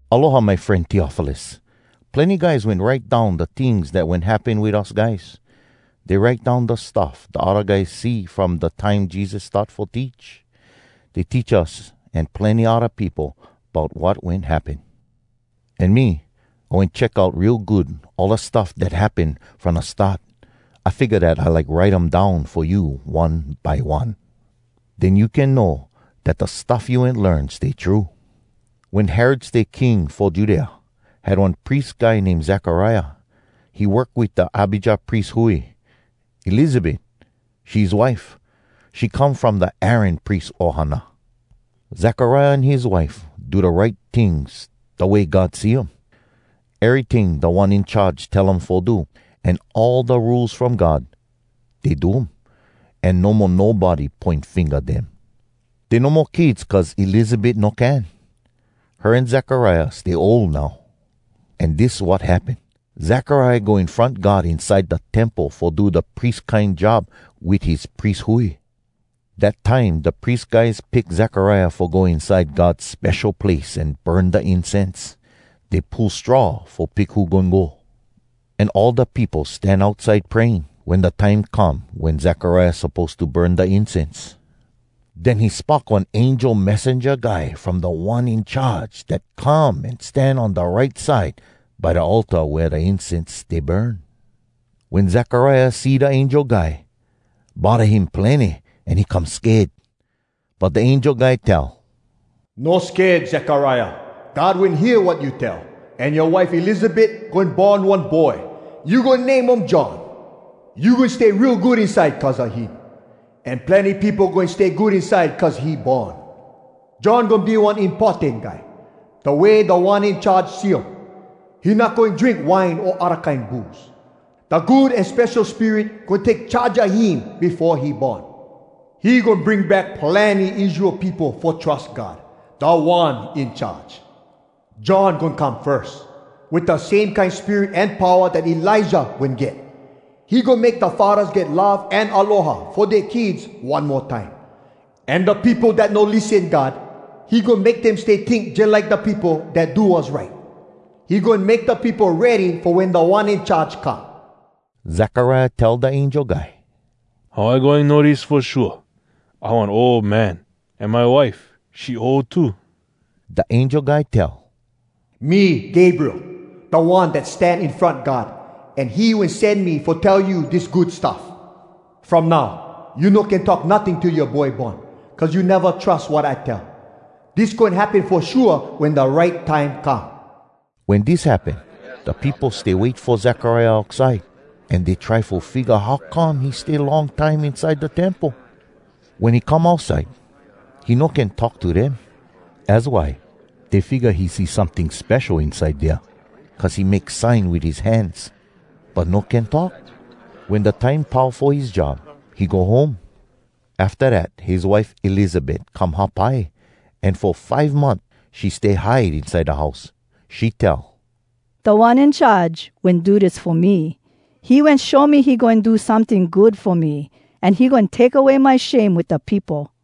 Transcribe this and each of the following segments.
Aloha, my fren Teofilus! Plenny guys wen write down da tings dat wen happen wit us guys. Dey write down da stuff da odda guys see from da time Jesus start fo teach. Dey teach us an plenny odda peopo bout wat wen happen. An me, I wen check out real good all da stuff dat happen from da start. I figga dat I like write um down fo you one by one. Den you can know dat da stuff you wen learn stay true. Wen Herod stay king fo Judea, had one pries guy name Zekariah. He work wit da Abijah pries hui. Elizabet, she his wife. She come from da Aaron pries ohana. Zekariah an his wife do da right tings da way God see um. Eryting Da One In Charge tell um fo do, an all da Rules From God, dey do um. An no mo nobody poin finga dem. Dey no mo kids cuz Elizabet no can. Her an Zekariah stay ol now. An dis wat happen. Zekariah go in front God inside da Temple fo do da pries kine job wit his pries hui. Dat time da pries guys pick Zekariah fo go inside God Spesho Place an burn da incense. Dey pull straw fo pick who goin go. An all da peopo stan outside praying wen da time come wen Zekariah suppose to burn da incense. Den he spock one angel messenja guy from Da One In Charge dat come an stan on da right side by da altar wea da incense stay burn. Wen Zekariah see da angel guy, bodda him plenny an he come sked. But da angel guy tell, “No sked, Zekariah! God wen hear wat you tell, an yoa wife Elizabet goin born one boy. You goin name um John. You goin stay real good inside cuz a him, an plenny peopo goin stay good inside cuz he born. John goin be one importan guy, da way Da One In Charge see um. He not goin drink wine o odda kine booze. Da Good An Spesho Spirit goin take charge a him befo he born. He goin bring back plenny Israel peopo fo trus God, Da One In Charge. John goin come firs, wit da same kine spirit an powa dat Elijah wen get. He goin make da faddahs get love an aloha fo dea kids one mo time. An da peopo dat no lissen God, he goin make dem stay tink jalike da peopo dat do wass right. He goin make da peopo ready fo wen Da One In Charge come.” Zekariah tell da angel guy, “How I goin know dis fo shua? I one ol man, an my wife, she ol too.” Da angel guy tell, “Me Gabriel, da one dat stan in front God, an he wen sen me fo tell you dis good stuff. From now, you no can talk notting till yoa boy born, cuz you neva trus wat I tell. Dis goin happen fo shua wen da right time come.” Wen dis happen, da peopo stay wait fo Zekariah outside, an dey try fo figga how come he stay long time inside da Temple. Wen he come outside, he no can talk to dem. Az why dey figga he see someting spesho inside dea, cuz he make sign wit his hands, but no can talk. Wen da time pau fo his job, he go home. Afta dat his wife Elizabet come hapai, an fo five month she stay hide inside da house. She tell, “Da One In Charge wen do dis fo me. He wen show me he goin do someting good fo me, an he goin take away my shame wit da peopo!”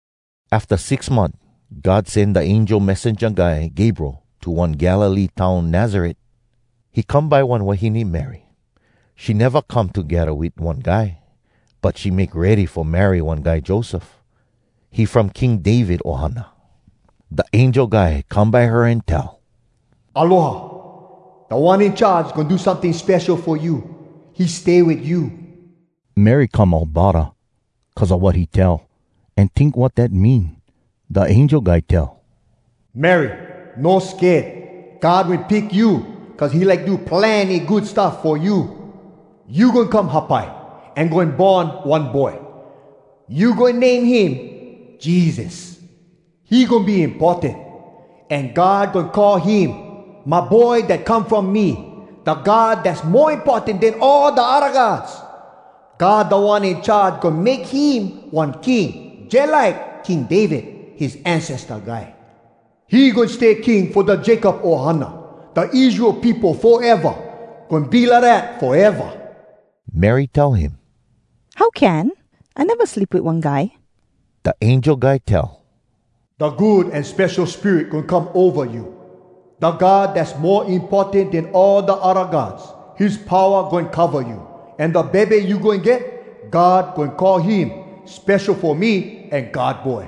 Afta six month God sen da angel messenja guy Gabriel to one Galilee town Nazaret. He come by one wahine Mary. She neva come togedda wit one guy, but she make ready fo marry one guy Joseph. He from King David ohana. Da angel guy come by her an tell, “Aloha! Da One In Charge goin do someting spesho fo you. He stay wit you.” Mary come all bodda cuz a wat he tell, an tink wat dat mean. Da angel guy tell, “Mary, no sked. God wen pick you, cuz he like do plenny good stuff fo you. You goin come hapai, an goin born one boy. You goin name him ‘Jesus.’ He goin be importan, An God goin call him ‘my Boy dat come from me, Da God Dass Mo Importan Den All Da Odda Gods.’ God Da One In Charge goin make him one king Jalike King David, his ancesta guy. He goin stay King fo da Jacob ohana, Da Israel peopo, foeva. Goin be lidat foeva.” Mary tell him, “How can? I neva sleep wit one guy.” Da angel guy tell, “Da Good An Spesho Spirit goin come ova you. Da God Dass Mo Importan Den All Da Odda Gods, his powa goin cova you. An da bebe you goin get, God goin call him ‘Spesho Fo Me’ an ‘God Boy.’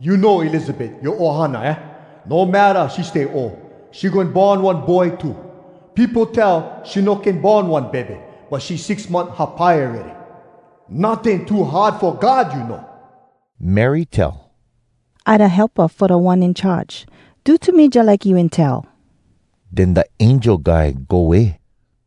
You know Elizabet, yoa ohana, aah? No matta she stay ol, she goin born one boy too. Peopo tell she no can born one bebe, but she six month hapai awready. Notting too hard fo God, you know.” Mary tell, “I da helpa fo Da One In Charge. Do to me jalike you wen tell.” Den da angel guy go way.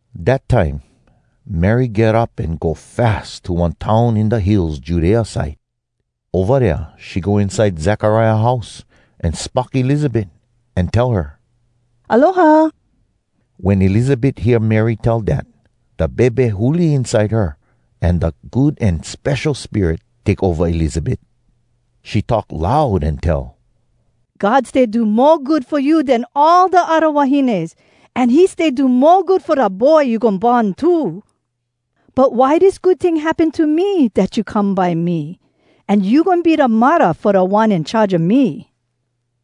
Dat time, Mary get up an go fas to one town in da hills Judea side. Ova dea she go inside Zekariah house, an spock Elizabet, an tell her, “Aloha!” Wen Elizabet hear Mary tell dat, da bebe huli inside her, an da Good An Spesho Spirit take ova Elizabet. She talk loud an tell, “God stay do mo good fo you den fo all da odda wahines, an he stay do mo good fo da boy you goin born too! But why dis good ting happen to me, dat you come by me, an you goin be da muddah fo Da One In Charge a me?!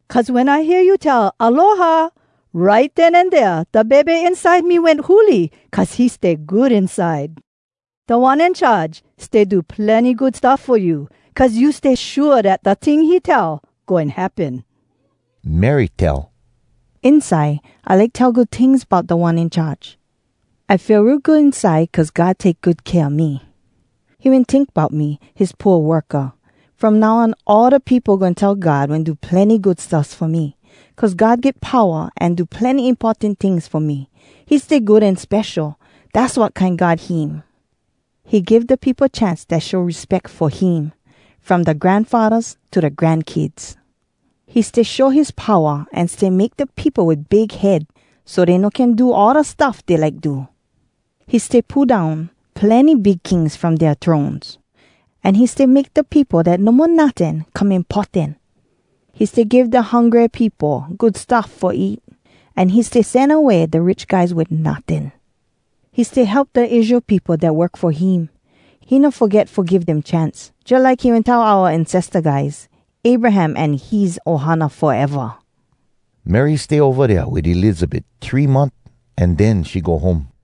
Cuz wen I hear you tell ‘Aloha,’ right den an dea da bebe inside me wen huli cuz he stay good inside. Da One In Charge stay do plenny good stuff fo you, cuz you stay shua dat da ting he tell goin happen.” Mary tell, “Inside, I like tell good tings Bout Da One In Charge. I feel real good inside Cuz God take good kea a me. He wen tink bout me, his pooa worka! From now on all da peopo goin tell God wen do plenny good stuffs fo me, Cuz God get powa An do plenny importan tings fo me. He stay good an spesho, Dass wat kine god him. He give da peopo chance Dat show respeck fo him, From da granfaddas to da grankids. He stay show his powa An stay make da peopo wit big head So dey no can do All da stuff dey like do. He stay pull down plenny big kings From dea thrones, An he stay make da peopo Dat no mo notting, come importan. He stay give da hungry peopo Good stuff fo eat, An he stay sen away da rich guys Wit notting. He stay help da Israel peopo Dat work fo him. He no foget fo give dem chance, Jalike he wen tell oua ancesta guys, Abraham an his ohana, foeva.” Mary stay ova dea wit Elizabet three month, an den she go home.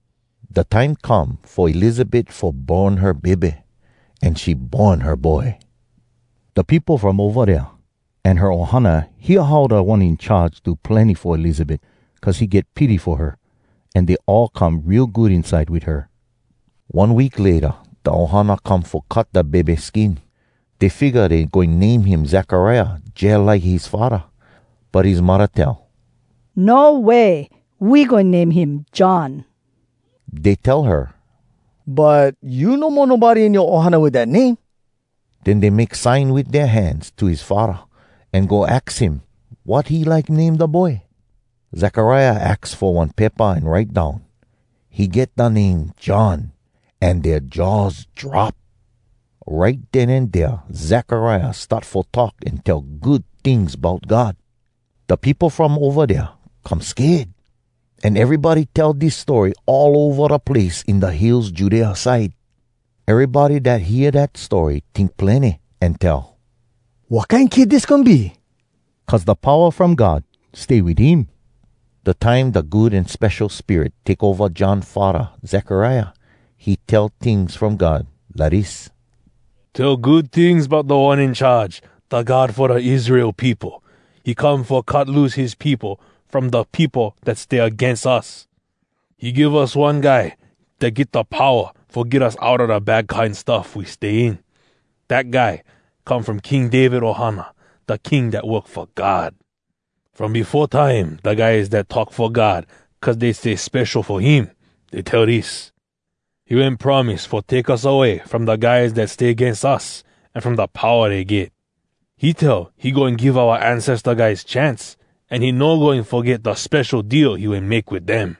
Da time come fo Elizabet fo born her bebe, an she born her boy. Da peopo from ova dea an her ohana hear how Da One In Charge do plenny fo Elizabet cuz he get pity fo her, an dey all come real good inside wit her. One week layta da ohana come fo cut da bebe skin. Dey figga dey goin name him Zekariah jalike his faddah. But his muddah tell, “No way! We goin name him ‘John.’” Dey tell her, “But you no mo nobody in yoa ohana wit dat name!” Den dey make sign wit dea hands to his faddah, an go aks him wat he like name da boy. Zekariah aks fo one paypa an write down, “He get da name ‘John.’” An dea jaws drop! Right den an dea Zekariah start fo talk an tell good tings bout God. Da peopo from ova dea come sked. An erybody tell dis story all ova da place in da hills Judea side. Erybody dat hear dat story tink plenny, an tell, “Wat kine kid dis goin be?” Cuz da powa from God stay wit him. Da time da Good An Spesho Spirit take ova John faddah Zekariah, he tell tings from God, lidis: “Tell good tings bout Da One In Charge, Da God fo da Israel peopo! He come fo cut loose his peopo From da peopo dat stay agains us. He give us one Guy dat get da powa Fo get us outa da bad kine stuff we stay in. Dat Guy come from King David ohana, Da king dat work fo God. From befo time da guys dat talk fo God Cuz dey stay spesho fo him, Dey tell dis: He wen promise fo take us away From da guys dat stay agains us An from da powa dey get. He tell he goin give oua ancesta guys chance, An he no goin foget da spesho deal he wen make wit dem.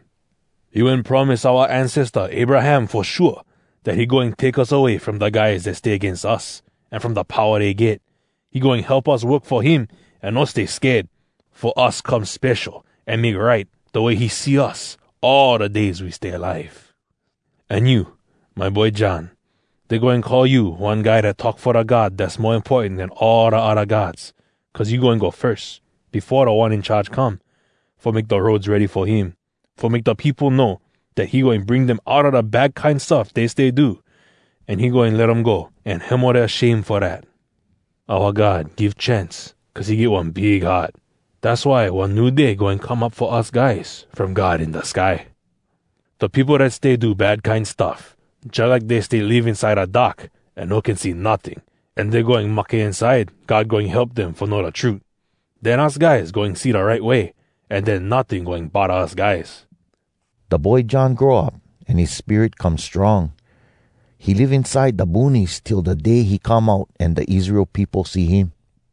He wen promise oua ancesta Abraham fo shua Dat he goin take us away from da guys dat stay agains us, An from da powa dey get, He goin help us work fo him an no stay sked, Fo us come spesho an make right da way he see us All da days we stay alive. An you, my boy John, dey goin call you One guy dat talk fo da God Dass Mo Importan Den All Da Odda Gods, Cuz you goin go firs, befo Da One In Charge come, Fo make da roads ready fo him, Fo make da peopo know Dat he goin bring dem outa da bad kine stuff dey stay do, An he goin let um go an hemo dea shame fo dat. Oua God give chance cuz he get one big heart. Dass why one new day goin come up fo us guys from God in da sky. Da peopo dat stay do bad kine stuff, Jalike dey stay live inside da dark an no can see notting, An dey goin mahke inside, God goin help dem fo know da trut. Den us guys goin see da right way, An den notting goin bodda us guys.” Da boy John grow up, an his spirit come strong. He live inside da boonies till da day he come out an da Israel peopo see him.